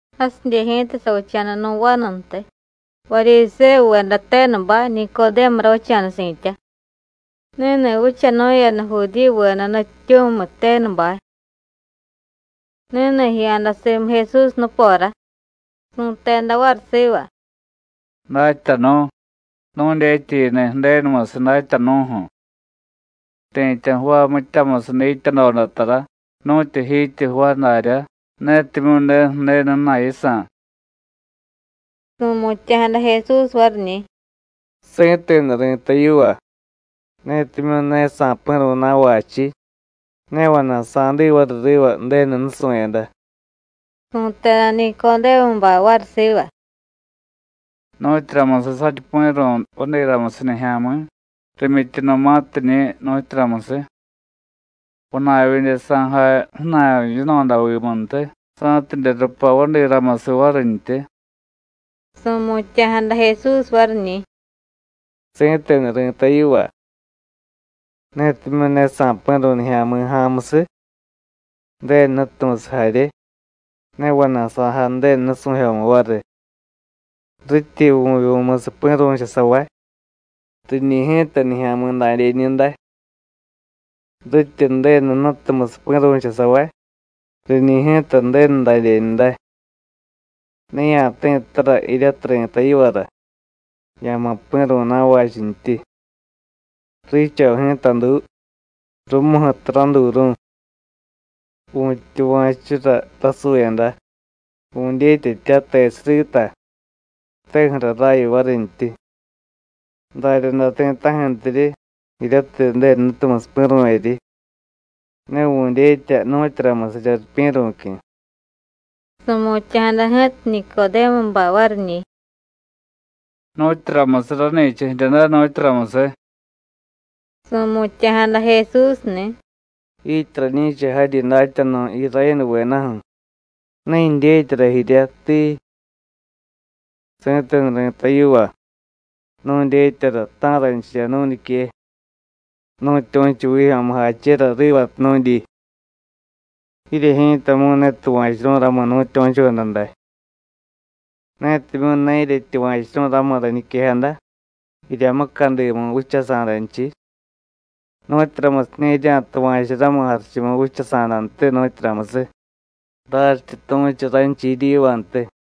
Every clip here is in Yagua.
Jasidye ji̱ta savicha̱da nu̱ vanuntiy, Varyisévuveda tenubay, Nicodému ravicha̱da si̱tya. Ni̱ni̱ vichanu̱yada Judíyuveda nutyityu̱miy tenubay. Ni̱ni̱ jiya̱da simu Jesús nupora, su̱teda variy siva: “Datyanu̱, nu̱dyetya yiniy Ju̱denumusiy datyanu̱ju̱. Ti̱tya jvaay mityamusiy dityadoda tara, nu̱tyu jityi jvaay darya, netimyu̱ ne Ju̱denu ju̱na̱y yisa̱.” Su̱mutya̱jada Jesús variñi̱: “Si̱tenu ri̱tay yiva: Ni̱timyu̱ ne sa̱pi̱ru̱y na̱vachiy, ne vana̱y sa̱diy variy riva Ju̱denu nusu̱yada.” Su̱teda Nicodémubay variy siva: “¿Nu̱tyuramusiy saryi pi̱ru̱y vadiramusiy nijya̱mi̱ rimyityunumatiñi̱, nu̱tyuramusiy? ¿Vana̱y vidye sa̱jay ju̱na̱y yino̱davimuntiy, sa̱tidye rupay vadiramusiy varintyi?” Su̱mutya̱jada Jesús variñi̱: “Si̱tenu ri̱tay yiva: Netimyu̱ ne sa̱pi̱ru̱y nijya̱mi̱ ja̱a̱musiy, Ju̱denu Jnutumusiy jarye, ne vana̱y sa̱jay Ju̱denu nusu̱jyomu variy. Rityi vu̱vyu̱musiy pi̱ru̱chusavay, riñi̱ ji̱ta nijya̱mi̱ dadyeñu day. Rityi Ju̱denu Jnutumusiy pi̱ru̱chusavay, riñi̱ ji̱ta Ju̱denu dadyeñu day. Ne ya̱ti̱ttara jiryatiy ri̱tay yivara: Ya̱ma̱ pi̱ru̱y na̱vachintyi. Riicho ji̱ta duu, rumuju̱tiy raduuru̱y. Vu̱tyuva̱chura rasuyada, vu̱dyetyatya tesiy rita, teju̱ra raya varintyi. Daryaday ti̱ta̱ju̱ntiryi jiryatiy Ju̱denu Jnutumusiy pi̱ru̱vyeryi (ne vu̱dyetya nu̱tyuramusirya ripyi̱ru̱cyu̱).” Su̱mutya̱jada ji̱ta Nicodémubay variñi̱: “¿Nu̱tyuramusiy rani̱cha jirya day, nu̱tyuramusiy?” Su̱mutya̱jada Jesúsni̱: “¡Jiityi rañi̱cha jaryi datyanu̱ Irayénuvedaju̱, ne jidyetyara jirya, tii! Si̱tenu ri̱tay yiva: Nu̱dyetyara ta̱ranchirya nu̱ñique, nu̱tyu̱chu vijyo̱mujachera rivatiy nu̱dyi; jirye ji̱tamu̱y ne tuva̱churu̱y ramu nu̱tyu̱choda day. Netimyu̱ ne jiryetyuva̱churu̱y ramu rañiquejada jirya mucadimu vichasa̱danchiy, ¿nu̱tyuramusiña̱ jirya̱tuva̱chu ramu jarichumu vichasa̱dantiy, nu̱tyuramusiy? raryityi tu̱chu ranchiy jiryivantiy.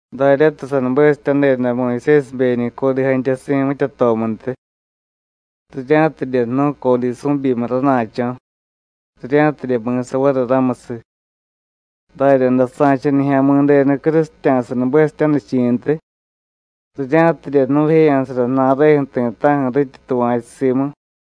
Daryatiy sanubesityadeda Muyusésibeñi̱ codiy jantyasi̱ mityatomuntiy, rirya̱tidye jnu̱y codiy su̱byimiy rana̱cho̱, rirya̱tidye mi̱sa variy ramusiy, daryaday sa̱cha Nijya̱mi̱denu crusitya̱sa nubesityanichi̱ntiy, rirya̱tidye jnu̱jeya̱sara ju̱na̱reju̱ ti̱ta̱ju̱ rityi tuva̱chu simu.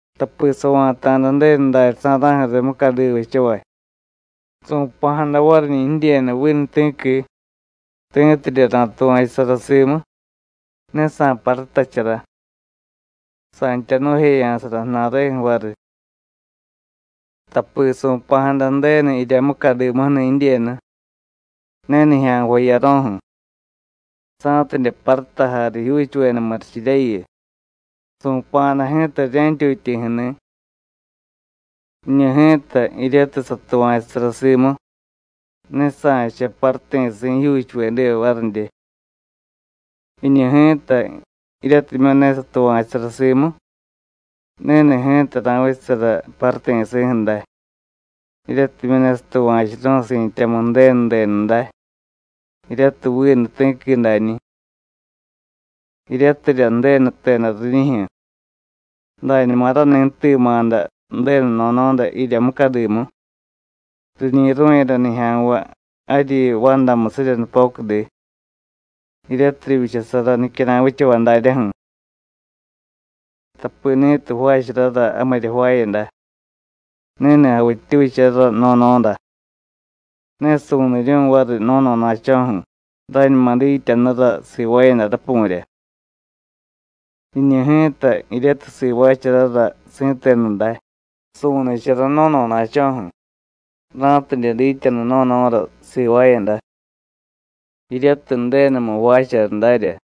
Tapi sava̱ta̱da Ju̱denu daryasa̱ra̱ju̱ riy mucadiva vichavay, su̱pa̱jada variñi̱ jidyenu vinu ti̱qui, ti̱tidye ra̱tuva̱chusara simu, ne sa̱parutachara, sa̱ntya jnu̱jeya̱sara ju̱na̱reju̱ variy. Tapi su̱pa̱jada Ju̱denu jirya mucadimuju̱ni̱ jidyenu, ne nijya̱nvay jiyaro̱ju̱, sa̱tidye parutajay rijyuuchuveda murichiryayu. Su̱pa̱jada ji̱ta rirya̱ntyutyi̱ju̱ni̱. Jiñu ji̱ta, jiryatiy satuva̱chusara simu, ne sa̱cha paruti̱si̱ jijyuuchuvediva varidye. Jiñu ji̱ta, jiryatimyu̱ ne satuva̱chusara simu, ni̱ni̱ ji̱ta ra̱vichasara paruti̱si̱ju̱ day, jiryatimyu̱ ne satuva̱churu̱y si̱tyamu Ju̱denu denu day, jiryatiy vinu ti̱qui dañi̱. Jiryatirya Ju̱denu jteda riñijyu̱: ‘Dañuma rani jtima̱da Ju̱denu no̱no̱da jirya mucadimu, riñi̱ru̱yada nijya̱nvay jaryi vandamusirya nupocudi, jiryatiy rivyichasara nicyara̱y vichavay daryaju̱.’ Tapi ni̱tiy jvaacharara jamirya jvaayada, ni̱ni̱ javittyucharara no̱no̱da. Ne su̱niryu̱y variy no̱no̱na̱cho̱ju̱ rañuma dityanura sivaayada rapu̱rya. Jiñu ji̱ta, jiryatiy sivaacharara si̱tenu day, su̱nichara no̱no̱na̱cho̱ju̱, ra̱tidye dityanu no̱no̱ra sivaayada, jiryatiy Ju̱denumu jvaachara darya.”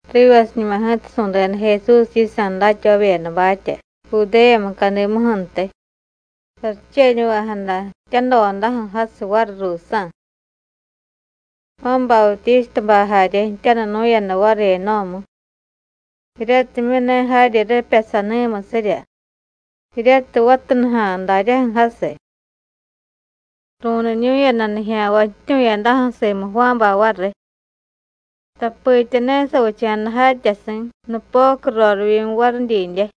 Rivasiñuma ji̱ta su̱deda Jesús yisa̱ datyavavyedabatya Judéya mucadimuju̱ntiy, saricheñuvejada jtyadodaju̱ jasiy variy ruusa̱. Juán Bautístabay jarye jtyanunu̱yada variy Enó̱mu, jiryatimyu̱ ne jaryi ripya Saní̱musírya, jiryatiy vatunuja̱a̱ daryaju̱ jasiy. Ru̱niñu̱yada nijya̱nvay jtyu̱yadaju̱ simu Juánbay variy. Tapitya ne savicha̱da jatyasi̱ nupocu rorivyimu variy didye.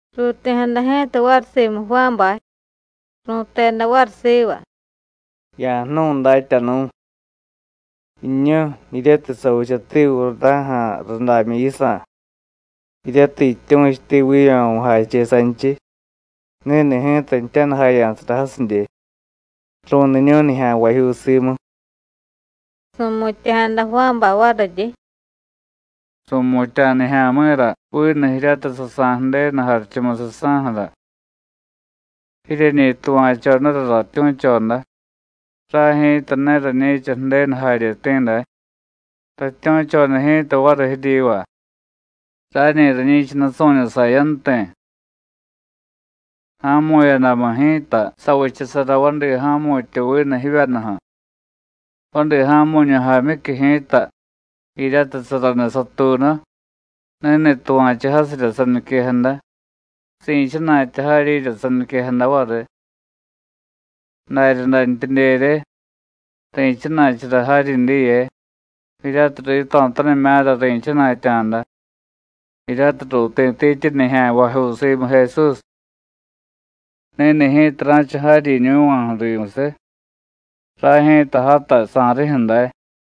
Ruuti̱jada ji̱ta variy simu Juánbay, ru̱teda variy siva: “Ya̱jnu̱y, Datyanu̱, jiñu jiryatiy savichati Jurdá̱ja̱ rudamyu yisa̱, jiryatiy jityu̱chuti vijyo̱mujache sanchiy, ni̱ni̱ ji̱ta jtyanujaya̱sara jasidye, ru̱niñu̱y nijya̱nvajyuu simu.” Su̱mutya̱jada Juánbay variryi: “Su̱mutya̱ nijya̱mi̱ra vinu jiryatiy sasa̱y Ju̱denu jarichumusiy saju̱ra. Jiryeñi tuva̱chodara ratyu̱choda: Ray ji̱ta ne rañi̱cha Ju̱denu jaryeti̱ day. Ratyu̱choda ji̱ta variy jiryiva: Rañi rañi̱cha nusu̱ñu sayanti̱. Ja̱mu̱yadamu ji̱ta, savichasara vadi ja̱mu̱tyu vinu jivyanuju̱. Vadi ja̱mu̱ñu jaamyicyu ji̱ta, jiryatiy saraniy satuunu, ni̱ni̱ tuva̱chu jasirya saniquejada, si̱chana̱tya jaryirya saniquejada variy. Daryadantyidyerye, ri̱chana̱chara jaryi diye, jiryatiy rito̱tanimya̱ra ri̱chana̱tya̱da, jiryatiy ruuti̱tityi nijya̱nvajyuu simu Jesús. Ni̱ni̱ ji̱ta ra̱cha jaryiñu̱va̱ju̱ rimusiy; ray ji̱ta játay sa̱rijyu̱ day.”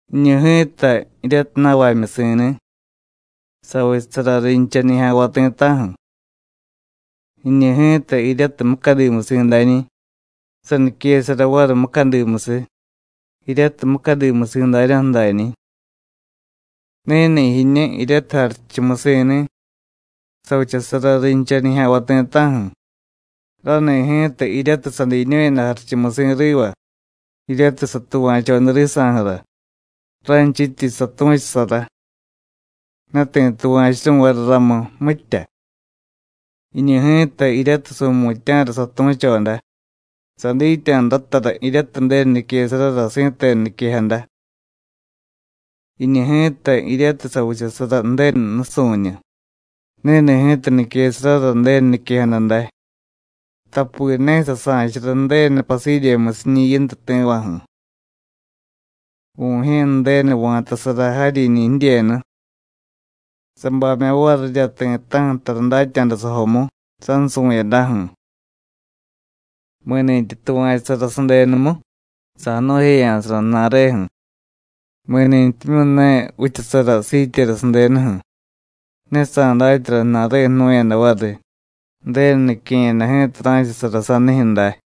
Jiñu ji̱ta, jiryatiy na̱vamyusi̱ni̱, savichasara rincha nijya̱nvay ti̱ta̱ju̱. Jiñu ji̱ta, jiryatiy mucadimusi̱ dañi̱, saniquesara variy mucadimusiy, jiryatiy mucadimusi̱ daryaju̱ dañi̱. Ni̱ni̱ jiñu jiryatiy jarichumusi̱ni̱, savichasara rincha nijya̱nvay ti̱ta̱ju̱. Rani̱ ji̱ta, jiryatiy sadiñu̱yada jarichumusi̱ riva, jiryatiy satuva̱choda risa̱ju̱ra, ranchityi satu̱chusara, ne ti̱ tuva̱churu̱y variy ramu, mitya. Jiñu ji̱ta jiryatiy su̱mutya̱ra satu̱choda, sadityanu ratara jiryatiy Ju̱denu niquesarara si̱tenu niquejada. Jiñu ji̱ta, jiryatiy savichasara Ju̱denu nusu̱ñu, ni̱ni̱ ji̱ta niquesarara Ju̱denu niquejada day, tapi ne sasa̱chara Ju̱denu pasidyemyusiñi̱ Yintu ti̱vaju̱. Vu̱jye̱ Ju̱denu va̱tasara jaryiñi̱ jidyenu, sabamya̱ varirya ti̱ta̱ju̱ tara datya̱da sajomu, sansu̱yadaju̱. Mi̱ni̱tyi tuva̱chusara sadenumu, sa̱jnu̱jeya̱sara ju̱na̱reju̱. Mi̱nintyimyu̱ ne vichasara siityera sadenuju̱, ne sa̱datyara ju̱na̱reju̱ jnu̱yada variy, Ju̱denu nique̱yada ji̱ta ra̱chasara sanijyu̱ day.